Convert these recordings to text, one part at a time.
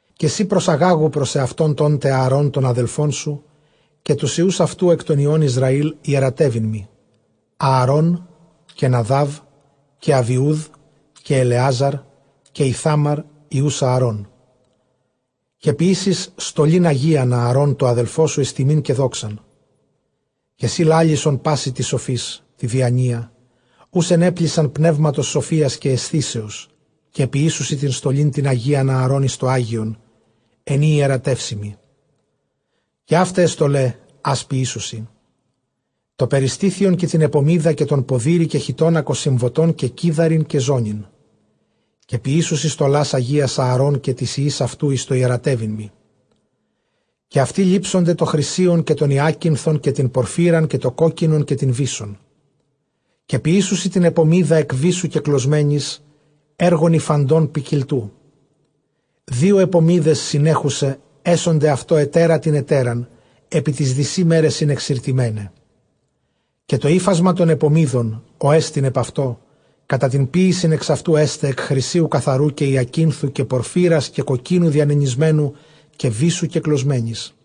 Καὶ σὺ προσαγάγου πρὸς σεαυτὸν τόν τε Ἀαρὼν τὸν ἀδελφόν σου, καὶ τοὺς υἱοὺς αὐτοῦ, καὶ ἐκ τῶν υἱῶν Ἰσραὴλ, ἱερατεύειν μοι Ἀαρὼν, καὶ Ναδὰβ, καὶ Ἀβιοὺδ, καὶ Ἐλεάζαρ, καὶ Ἰθάμαρ, υἱοὺς Ἀαρών. Καὶ ποιήσεις στολὴν ἁγίαν Ἀαρὼν τῷ ἀδελφῷ σου εἰς τιμὴν καὶ δόξαν. Καὶ σύ λάλησον πᾶσι τοῖς σοφοῖς τῇ διανοίᾳ, οὓς ἐνέπλησα πνεύματος σοφίας καὶ αἰσθήσεως· καὶ ποιήσουσι τὴν στολὴν τὴν ἁγίαν Ἀαρὼν εἰς τὸ ἅγιον, ἐν ᾗ ἱερατεύσει μοι. Καὶ αὗται αἱ στολαὶ, ἃς ποιησουσι· τὸ περιστήθιον, καὶ τὴν ἐπωμίδα, καὶ τὸν ποδήρη, καὶ χιτῶνα κοσυμβωτὸν, καὶ κίδαριν, καὶ ζώνην· καὶ ποιήσουσι στολὰς ἁγίας Ἀαρὼν καὶ τοῖς υἱοῖς αὐτοῦ εἰς τὸ ἱερατεύειν μοι. Καὶ αὐτοὶ λήψονται τὸ χρυσίον, καὶ τὸν ὑάκινθον, καὶ τὴν πορφύραν, καὶ τὸ κόκκινον, καὶ τὴν βύσσον. Καὶ ποιήσουσι τὴν ἐπωμίδα ἐκ βύσσου κεκλωσμένης, ἔργον ὑφαντὸν ποικιλτοῦ. Δύο ἐπωμίδες συνέχουσαι ἔσονται αὐτῷ ἑτέρα τὴν ἑτέραν, ἐπὶ τοῖς δυσὶ μέρεσιν ἐξηρτισμέναι. Καὶ τὸ ὕφασμα τῶν ἐπωμίδων ὅ ἐστιν ἐπʼ αὐτῷ, κατὰ τὴν ποίησιν ἐξ αὐτοῦ ἔσται ἐκ χρυσίου καθαροῦ, καὶ ὑακίνθου, καὶ πορφύρας, καὶ κοκκίνου διανενησμένου, καὶ βύσσου κεκλωσμένης.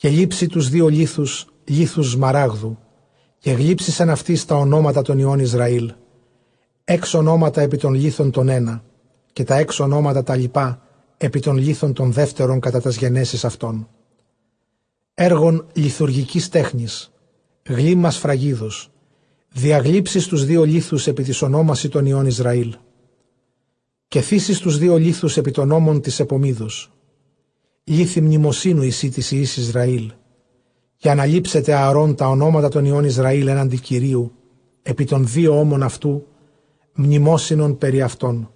Καὶ λήψῃ τοὺς δύο λίθους, λίθους σμαράγδου, καὶ γλύψεις ἐν αὐτοῖς τὰ ὀνόματα τῶν υἱῶν Ἰσραήλ. Ἓξ ὀνόματα ἐπὶ τὸν λίθον τὸν ἕνα, καὶ τὰ ἓξ ὀνόματα τὰ λοιπὰ ἐπὶ τὸν λίθον τὸν δεύτερον κατὰ τὰς γενέσεις αὐτῶν. Ἔργον λιθουργικῆς τέχνης· γλύμμα σφραγίδος διαγλύψεις τοὺς δύο λίθους ἐπὶ τοῖς ὀνόμασι τῶς υἱῶν Ἰσρσήλ. Καὶ θήσεις τοὺς δύο λίθους ἐπὶ τῶς ὤμων τῆς ἐπωμίδος· λίθοι μνημοσύνου εἰσὶ τοῖς υἱοῖς Ἰσραήλ· καὶ ἀναλήψεται Ἀαρὼν τὰ ὀνόματα τῶν υἱῶν Ἰσραὴλ ἔναντι Κυρίου ἐπὶ τῶν δύο ὤμων αὐτοῦ, μνημόσυνον πεπὶ αὐτῶν.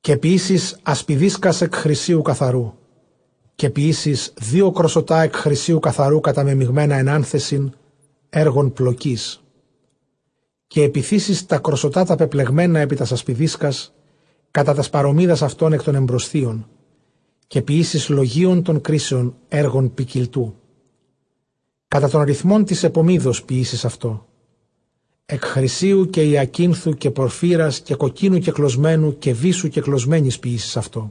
Καὶ ποιήσεις ἀσπιδίσκας ἐκ χρυσίου καθαροῦ. Καὶ ποιήσεις δύο κροσωτὰ ἐκ χρυσίου καθαροῦ, καταμεμιγμένα ἐν ἄνθεσιν, ἔργον πλοκῆς· καὶ ἐπιθήσεις τὰ κροσσωτὰ τὰ πεπλεγμένα ἐπὶ τὰς ἀσπιδίσκας, κατὰ τὰς παρωμίδας αὐτῶν ἐκ τῶν ἐμπροσθίων. Καὶ ποιήσεις λογεῖον τῶν κρίσεων, ἔργον ποικιλτοῦ· κατὰ τὸν ῥυθμὸν τῆς ἐπωμίδος ποιήσεις αὐτὸ ἐκ χρυσίου, καὶ ὑακίνθου, καὶ πορφύρας, καὶ κοκκίνου κεκλωσμένου, καὶ βύσσου κεκλωσμένης. Ποιήσεις αὐτό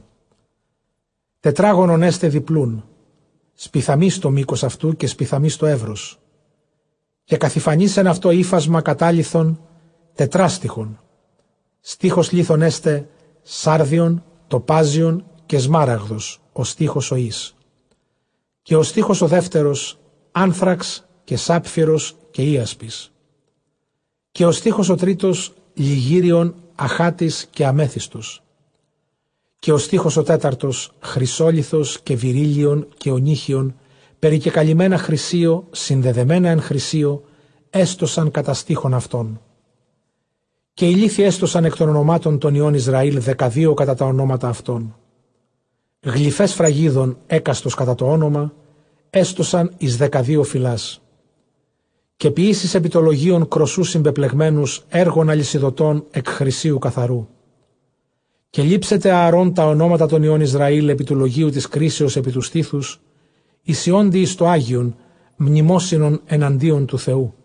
τετράγωνον· ἔσται διπλοῦν, σπιθαμῆς τὸ μῆκος αὐτοῦ, καὶ σπιθαμῆς τὸ εὖρος. Καὶ καθυφανεῖς ἐν αὐτῷ ὕφασμα κατάλιθον τετράστιχον· στίχος λίθων ἔσται, σάρδιον, τοπάζιον, καὶ σμαράγδος, ὁ στίχος ὁ εἷς. Καὶ ὁ στίχος ὁ δεύτερος, ἄνθραξ, καὶ σάπφειρος, καὶ ἴασπις. Καὶ ὁ στίχος ὁ τρίτος, λιγύριον, ἀχάτης, ἀμέθυστος. Καὶ ὁ στίχος ὁ τέταρτος, χρυσόλιθος, καὶ βηρύλλιον, καὶ ὀνύχιον, περικεκαλυμμένα χρυσίῳ, συνδεδεμένα ἐν χρυσίῳ· ἔστωσαν κατὰ στίχον αὐτῶν. Καὶ οἱ λίθοι ἔστωσαν ἐκ τῶν ὀνομάτων τῶν υἱῶν Ἰσραὴλ δεκαδύο κατὰ τὰ ὀνόματα αὐτῶν· γλυφαὶ σφραγίδων, ἕκαστος κατὰ τὸ ὄνομα ἔστωσαν εἰς δεκαδύο φυλάς. Καὶ ποιήσεις ἐπὶ τὸ λογιον κρωσσοὺς συμπεπλεγμένους, ἔργον ἁλυσιδωτὸν ἐκ χρυσίου καθαροῦ. Καὶ λήψεται Ἀαρὼν τὰ ὀνόματα τῶν υἱῶν Ἰσραὴλ ἐπὶ τοῦ λογείου τῆς κρίσεως ἐπὶ τοῦ στήθους, εἰσιόντι εἰς τὸ ἅγιον μνημόσυνου ἐναντίον τοῦ Θεοῦ.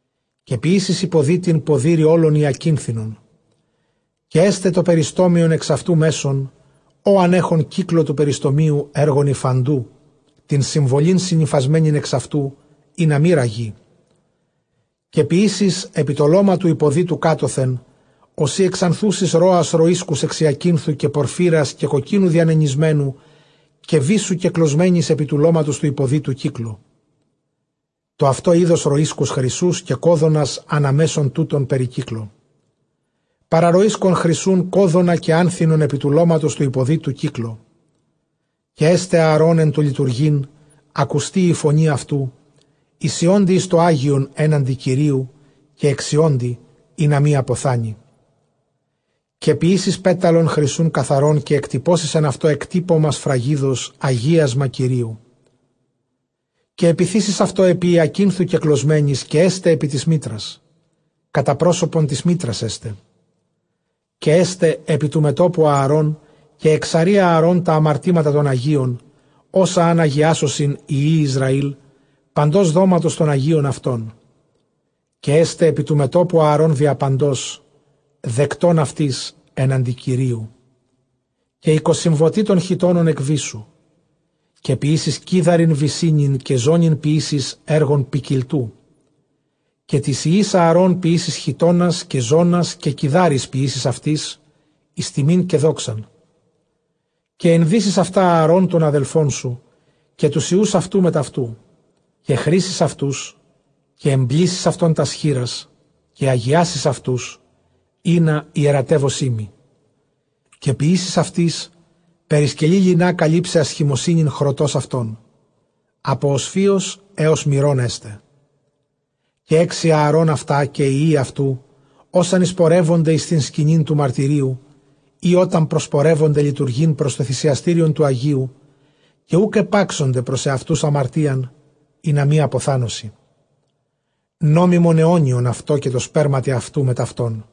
Καὶ ποιήσεις ὑποδύτην ποδήρη ὅλον ὑακίνθινον. Καὶ ἔσται τὸ περιστόμιον ἐξ αὐτοῦ μέσον, ὤαν ἔχον κύκλῳ τοῦ περιστομίου, ἔργον ὑφαντου, τὴν συμβολὴν συνυφασμένην ἐξ αὐτοῦ, ἵνα μὴ ῥαγῇ. Καὶ ποιήσεις ὑπὸ τὸ λῶμα τοῦ ὑποδύτου κάτωθεν, ὡσεὶ ἐξανθούσης ῥόας ῥοΐσκους ἐξ ὑακίνθου, καὶ πορφύρας, καὶ κοκκίνου διανενησμένου, καὶ βύσσου κεκλωσμένης, ὑπὸ τοῦ λώματος τοῦ ὑποδύτου κύκλῳ· τὸ αὐτὸ εἶδος ῥοΐσκους χρυσοῦς, καὶ κώδωνας ἀναμέσον τούτων περικύκλῳ. Παρὰ ῥοΐσκον χρυσοῦν δώδωνα, καὶ ἄνθινον ἐπὶ τοῦ λώματος τοῦ ὑποδύτου κύκλῳ· Καὶ ἔσται Ἀαρὼν ἐν τῷ λειτουργεῖν ἀκουστὴ ἡ φωνὴ αὐτοῦ, εἰσιόντι εἰς τὸ ἅγιον ἔναντι Κυρίου, καὶ ἐξιόντι, ἵνα μὴ ἀποθάνῃ. Καὶ ποιήσεις πέταλον χρυσοῦν καθαρόν· καὶ ἐκτυπώσεις ἐν αὐτῷ ἐκτύπωμα σφραγίδος, Ἁγίασμα Κυρίου. Καὶ ἐπιθήσεις αὐτὸ ἐπὶ ὑακίνθου κεκλωσμένης· καὶ ἔσται ἐπὶ τῆς μίτρας, κατὰ πρόσωπον τῆς μίτρας ἔσται. Καὶ ἔσται ἐπὶ τοῦ μετώπου Ἀαρών· καὶ ἐξαρεῖ Ἀαρὼν τὰ ἁμαρτήματα τῶν ἁγίων, ὅσα ἂν ἁγιάσωσιν οἱ υἱοὶ Ἰσραὴλ παντὸς δόματος τῶν ἁγίων αὐτῶν· καὶ ἔσται ἐπὶ τοῦ μετώπου Ἀαρὼν διαπαντὸς δεκτὸν αὐτοῖς ἔναντι Κυρίου. Καὶ οἱ κοσυμβωτοὶ τῶν χιτώνων ἐκ βύσσου· καὶ ποιήσεις κίδαριν βυσσίνην· καὶ ζώνην ποιήσεις, ἔργον ποικιλτοῦ. Καὶ τοῖς υἱοῖς Ἀαρὼν ποιήσεις χιτῶνας καὶ ζώνας, καὶ κιδάρεις ποιήσεις αὐτοῖς εἰς τιμὴν καὶ δόξαν. Καὶ ἐνδύσεις αὐτὰ Ἀαρὼν τὸν ἀδελφόν σου, καὶ τοὺς υἱοὺς αὐτοῦ μετʼ αὐτοῦ· καὶ χρίσεις αὐτοὺς, καὶ ἐμπλήσεις αὐτῶν τὰς χεῖρας· καὶ ἁγιάσεις αὐτοὺς, ἵνα ἱερατεύωσί μοι. Καὶ ποιήσεις αὐτοῖς περισκελῆ λινᾶ καλύψαι ἀσχημοσύνην χρωτὸς αὐτῶν, ἀπὸ ὀσφύος ἕως μηρῶν ἔσται. Καὶ ἕξει Ἀαρὼν αὐτὰ καὶ οἱ υἱοὶ αὐτοῦ, ὅταν εἰσπορεύωνται εἰς τὴν σκηνὴν τοῦ μαρτυρίου, ἢ ὅταν προσπορεύωνται λειτουργεῖν πρὸς τὸ θυσιαστήριον τοῦ ἁγίου· καὶ οὐκ ἐπάξονται πρὸς ἑαυτοὺς ἁμαρτίαν, ἵνα μὴ ἀποθάνωσι· νόμιμον αἰώνιον αὐτῷ, καὶ τῷ σπέρματι αὐτοῦ μετʼ αὐτόν.